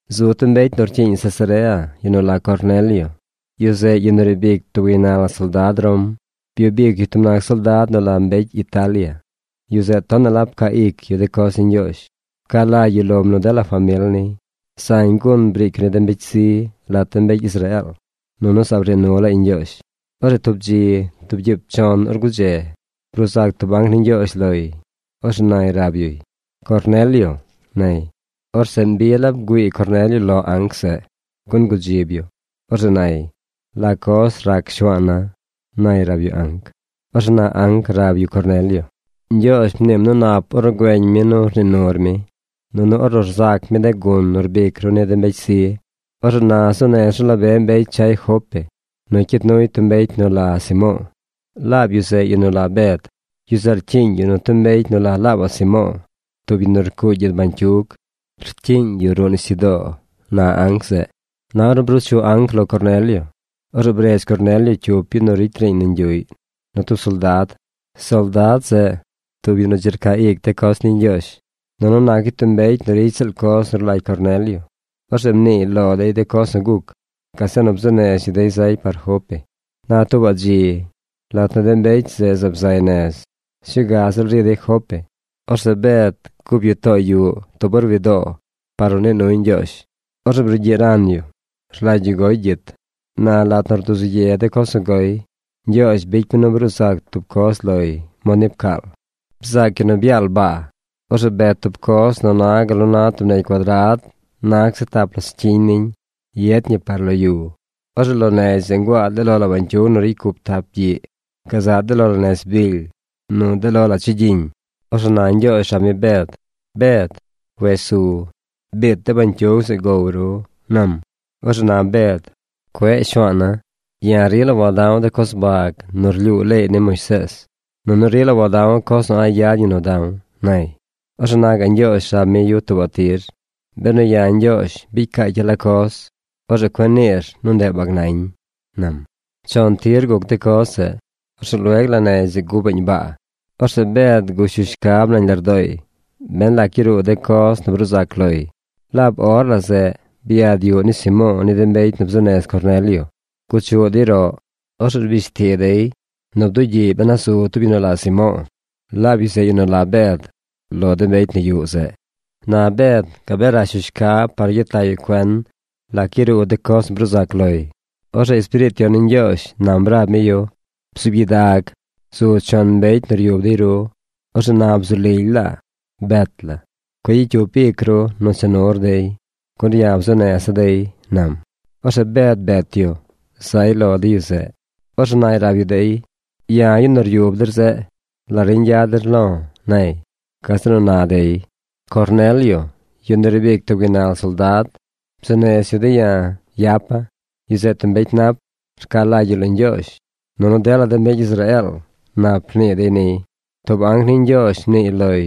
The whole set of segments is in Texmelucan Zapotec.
Zu tub mbecy nu rcyiiñ Cesarea, yu nu la Cornelio. Yu zeꞌ yu nu riib ic tub gaynal soldad Rom. Byub ic yu tub nac soldad nu la Mbecy Italia. Yu zeꞌ tonaꞌ la pcaa ic yu de coz ni Ñgyoozh. Pca lagy yu lom nu dela famil niy. Zañ gun briic yu ni de mbecy zi lat de mbecy Israeel, nunu zaab rnii nu laay Ñgyoozh. Orzeꞌ tub dzi, tub gyiib chon or gudze, bruu zac tub anc ni Ñgyoozh loy. Orzeꞌ nay rab yuy: ―¡Cornelio! ―nay. Orzeꞌ mbi la bgüii Cornelio lo anc zeꞌ gun gudzib yu. Orzeꞌ nay: ―¿La coz rac shuaana̱? ―nay rab yu anc. Orzeꞌ na anc rab yu Cornelio: ―Ñgyoozh mniim nu nap ornu güeñ mi nu rnii nur mi, nunu ornu rzac mi de gun nu rbic ru ni de mbecy zi. Orzeꞌ na zuu nez ru la be mbecy chay Jope nu cyid nuy tub mbecy nu la Simo̱o̱. Laab yu zeꞌ yu nu la Bed. Yu zeꞌ rcyiiñ yu nu tub mbecy nu la laabaꞌ Simo̱o̱, tub yu nu rcuugy gyid bañcyug. Rcyiiñ yu ruꞌ nisyudoo ―na anc zeꞌ. Na ornu bruu chu anc lo Cornelio. Orzeꞌ bredz Cornelio cyup yu nu ricy riiñ nañ yuꞌy nu tub soldad. Soldad zeꞌ tub yu nu dzi rcaa ic de coz ni Ñgyoozh, nunu nac yu mbecy nu ricy ziꞌl coz nu rlagy Cornelio. Orzeꞌ mniiy lo dey de coz nu guc. Gazeꞌ nu bzuu nez yu dey zay par Jope. Na tuubaꞌ dzi, lat nu de mbecy zeꞌ zaab zay nez, sñuu ga ziꞌl ri dey Jope, orzeꞌ Bed gup yu too yuꞌ tub or wi doo par nu nii nuy Ñgyoozh. Orzeꞌ brugyiꞌ ran yu. Rlagy yu goy gyit. Na lat nu rduzu ye de coz nu goy, Ñgyoozh bicy mi nu bruu zac tub coz loy mod ni pcaal. Bzaac yu nu byaal baa. Orzeꞌ bet tub coz nu na gal nu na tub negy cuadrad nag seꞌ tap la scyiñ niñ yet ñi par lo yu. Orzeꞌ lo negy zeꞌ nguaa de lo la bañcyug nu ricy cup tap gyiꞌ: gazaꞌ de lo la nez bily nu de lo la chigyiñ. Orzeꞌ na Ñgyoozh rab mi Bed: ―Bed, wes su. Biit de bañcyug zeꞌ gow ru ―nam. Orzeꞌ na Bed: ―Cueꞌ Shuaana̱. Ya̱ rila wada̱w de coz bag nu rlyuu leey ni Moisees, nunu rila wada̱w coz nu a̱ꞌ yad ñi nu da̱w ―nay. Orzeꞌ na gaꞌ Ñgyoozh rab mi yu tuubaꞌ tir: ―Benu ya̱ Ñgyoozh bicy caacya̱ la coz, orzeꞌ cueꞌ niir nu ndeꞌ bag nañ ―nam. Chon tir guc de coz zeꞌ. Orzeꞌ lueg la negy zeꞌ gupaꞌñ baa. Orzeꞌ Bed gush yu shcab nañ lardooy ben lac yaruu de coz nu bruu zac loy. Laab or la zeꞌ byad yuꞌ ni Simo̱o̱ ni de mbecy nu bzuu nez Cornelio. Guchuꞌ dey roꞌ. Orzeꞌ rbish ti dey nu bdugyiꞌy ben a zu tub yu nu la Simo̱o̱, laab yu zeꞌ yu nu la Bed, lo de mbecy nu yuꞌ zeꞌ. Na Bed gabee rash yu shcab par nu gyet lag yu cuen lac yaruu de coz nu bruu zac loy. Orzeꞌ Espiriit Yon ni Ñgyoozh nam rab mi yu: ―Bzuub gyidag. Zu chon mbecy nu ryub dey ru. Orzeꞌ na bzu lily laa. Bet la. Cueꞌ gyicy cyup ic ru nu cha nur dey, gun ya̱ bzuu neza̱ dey ―nam. Orzeꞌ Bed bet yu. Zay lo de yu zeꞌ. Orzeꞌ nay rab yu dey: ―Ya̱ yu nu ryub der zeꞌ. ¿La riñ yad der lo̱? ―nay. Gazeꞌ nu na dey: ―Cornelio, yu nu riib ic tub gaynal soldad, bzuu nez yu de̱ ya̱ yapa̱. Yu zeꞌ tub mbecy nap. Rca lagy yu lo Ñgyoozh. Nunu dela de mbecy Israeel nap rnii dey niy. Tub anc ni Ñgyoozh mniiy loy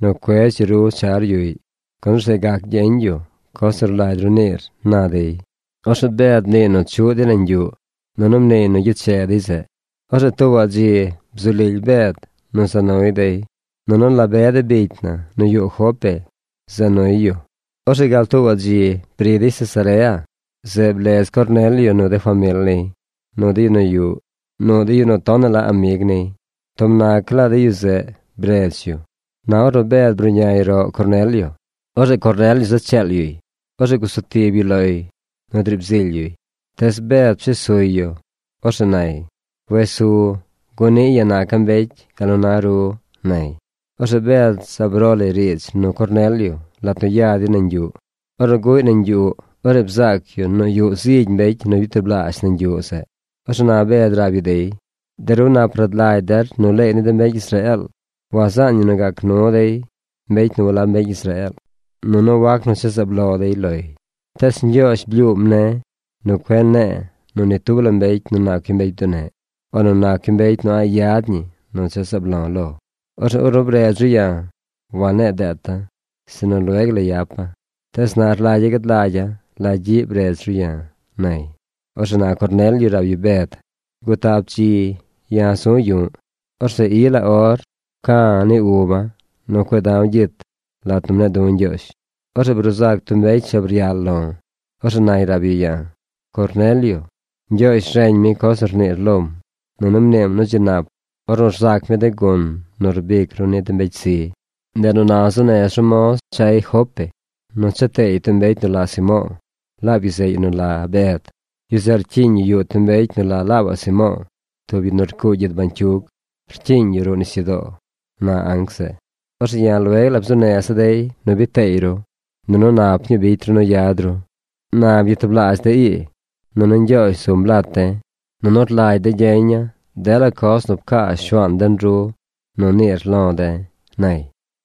nu cuedz yu ru char yuꞌy, gun orzeꞌ gac gyeñ yu coz nu rlagy ru niir ―na dey. Orzeꞌ Bed mniiy nu chuꞌ dey nañ yuꞌ, nunu mniiy nu gyeche dey zeꞌ. Orzeꞌ tuubaꞌ dzi bzu lily Bed nu za nuy dey, nunu la be de bicy na nu yuꞌ Jope za nuy yu. Orzeꞌ gal tuubaꞌ dzi bri dey Cesarea. Zeꞌ blez Cornelio, nu de famil niy, nu de yu nu tonaꞌ la amig niy. Tub nac laa de yu zeꞌ bredz yu. Na ornu Bed bruꞌñay roꞌ Cornelio, orzeꞌ Cornelio za cheel yuy. Orzeꞌ gusu tib yu loy nu driib zily yuy. Tees Bed pshes suy yu. Orzeꞌ nay: ―Wes su gun niꞌ ya̱ naca̱ mbecy gal nu na ru ―nay. Orzeꞌ Bed zaab ro lay riidz nu Cornelio lat nu ya dey nañ yuꞌ. Ornu guꞌy nañ yuꞌ, orzeꞌ bzaac yu nu yuꞌ zigy mbecy nu byatublaazh nañ yuꞌ zeꞌ. Orzeꞌ na Bed rab yu dey: ―De ru nap rad lagy der nu leey ni de mbecy Israeel wazaan ñi nu gac nu dey mbecy nu walab mbecy Israeel. Nunu wac nu cha zaab lo dey loy. Tees Ñgyoozh blyuum ne̱ nu cueꞌ ne̱e̱ lo ni tub mbecy nu nac yu mbecy bduneꞌ o nu nac yu mbecy nu a̱ꞌ yad ñi nu cha zaab lo̱ lo. Orzeꞌ ornu bredz ru ya̱, wanne̱e̱ deeta̱, sinu lueg la yapa̱. Tees na rlagya̱ gad lagya̱ la gyiꞌ bredz ru ya̱ ―nay. Orzeꞌ na Cornelio rab yu Bed: ―Gutap dzi ya̱ zu̱ yu̱ꞌ. Orzeꞌ i la or pca̱ uba̱ nu cueꞌ da̱w gyit lat nu mne̱e̱ du̱ Ñgyoozh. Orzeꞌ bruu zac tub mbecy shab ryal lo̱. Orzeꞌ nay rab yu ya̱: “Cornelio, Ñgyoozh reñ mi coz nu rniir lom, nunu mniim nu dzi nap ornu rzac mi de gun nu rbic ru ni de mbecy zi. Ndeꞌ nu na zuu nez ru moz chay Jope nu cha teey tub mbecy nu la Simo̱o̱, laab yu zeꞌ yu la Bed. Yu zeꞌ rcyiiñ yu yuꞌ tub mbecy nu la laabaꞌ Simo̱o̱, tub yu nu rcuugy gyid bañcyug. Rcyiiñ yu ruꞌ nisyudoo”, na anc zeꞌ. Orzeꞌ ya̱ lueg la bzuu neza̱ dey nu biid teey ru. Nunu nap ñuu bicy ru nu yad ru. Na byatublaazh de̱ ii, nunu Ñgyoozh zum lat de̱, nunu rlagy de̱ gyeña̱ dela coz nu pcaa Shuaan den ru nu niir lo de̱ ―nay.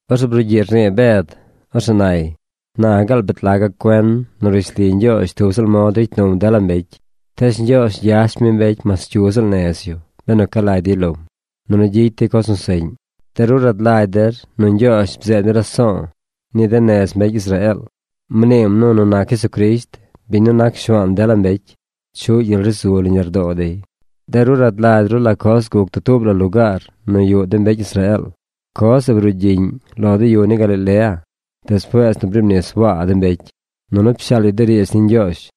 Orzeꞌ brugyiꞌ rnii Bed. Orzeꞌ nay: ―Na gaal bet laga̱ cuen nu rishli Ñgyoozh tub ziꞌl mod ricy num dela mbecy. Tees Ñgyoozh gyash mi mbecy mas cyu ziꞌl nez yu benu ca lagy dey lom, nunu gyicy dey coz nu seꞌñ. De ru rad lagy der nu Ñgyoozh bzeed mi raso̱o̱ ni de nez mbecy Israeel. Mniim nu nu nac Jesucrisht, biñ nu nac Shuaan dela mbecy, chuꞌ gyel ri zu nañ lardoo dey. De ru rad lagy ru la coz guc dutuub la lugaar nu yuꞌ de mbecy Israeel. Coz zeꞌ brugyiꞌñ lo de yu ni Galilea, despuees nu briib nis Waa de mbecy, nunu pshaal yu de riidz ni Ñgyoozh.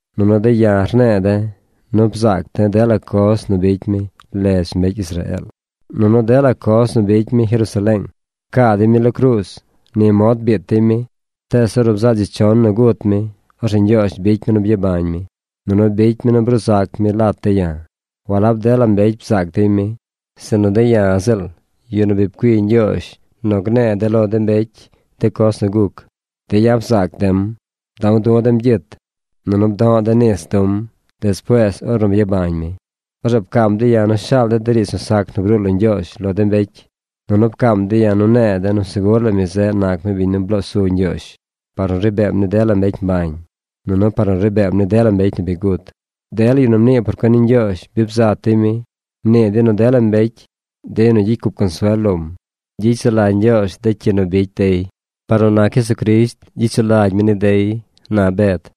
Nunu de̱ ya̱ rne̱e̱ de̱ nu bzaac de̱ dela coz nu bicy mi ledz mbecy Israeel, nunu dela coz nu bicy mi Jerusaleeng. Pcaa dey mi lo cruuz. Ni mod biit dey mi. Tees ornu bzaꞌ dzi chon nu gut mi, orzeꞌ Ñgyoozh bicy mi nu byabañ mi, nunu bicy mi nu bruu zac mi lat de̱ ya̱. Walab dela mbecy bzaac dey mi, sinu de̱ ya̱ ziꞌl, yu nu bi pcui Ñgyoozh nu gne̱e̱ de̱ lo de mbecy de coz nu guc, de̱ ya̱ bzaac de̱m. Bda̱w du̱ de̱m gyit, nunu bdo̱ꞌ de̱ nis du̱m despuees ornu byabañ mi. Orzeꞌ pcaam de̱ ya̱ nu shaal de̱ de riidz nu sac nu bruu lo Ñgyoozh lo de mbecy, nunu pcaam de̱ ya̱ nu ne̱e̱ de̱ nu segur la mi zeꞌ nac mi biñ nu bloo su Ñgyoozh par nu ri beem ni dela mbecy mbañ, nunu par nu ri beem ni dela mbecy nu bi gut. Dela yu nu mnii por cuen ni Ñgyoozh bi bzat dey mi. Mnii dey nu dela mbecy, de yu nu gyicy cup consuel lom, gyicy sulagy Ñgyoozh de cyi nu bicy dey. Par nu nac Jesucrisht gyicy sulagy mi ni dey ―na Bed.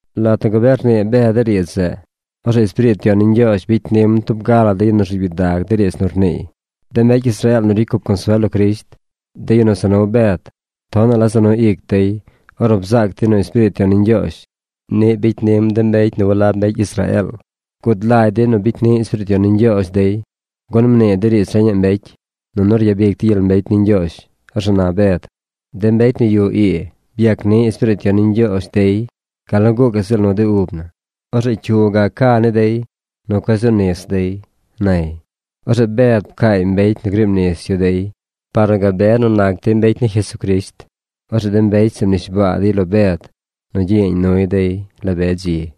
Lat nu gabee rnii Bed de riidz zeꞌ, orzeꞌ Espiriit Yon ni Ñgyoozh bicy nim tub ga la de yu nu rzuub gyidag de riidz nu rniiy. De mbecy Israeel nu ricy cup consuel lo Crisht, de yu nu za nu Bed, tonaꞌ la za nu ic dey ornu bzaac dey nu Espiriit Yon ni Ñgyoozh niꞌ bicy nim de mbecy nu walab mbecy Israeel. Gud lagy dey nu bicy ni Espiriit Yon ni Ñgyoozh dey, gun mnii dey riidz reñaꞌ mbecy, nunu ryabic dey gyel mbecy ni Ñgyoozh. Orzeꞌ na Bed: ―De mbecy nu yuꞌ ii byac ni Espiriit Yon ni Ñgyoozh gal nu gucaꞌ ziꞌl nu de ub na. Orzeꞌ ¿cyu gac ca ni dey nu cueꞌ zu nis dey? ―nay. Orzeꞌ Bed pcaay mbecy nu griib nis yu dey par nu gabe nu nac dey mbecy ni Jesucrisht. Orzeꞌ de mbecy zeꞌ mnishbaa dey lo Bed nu gyiyeeñ nuy dey la be dzi.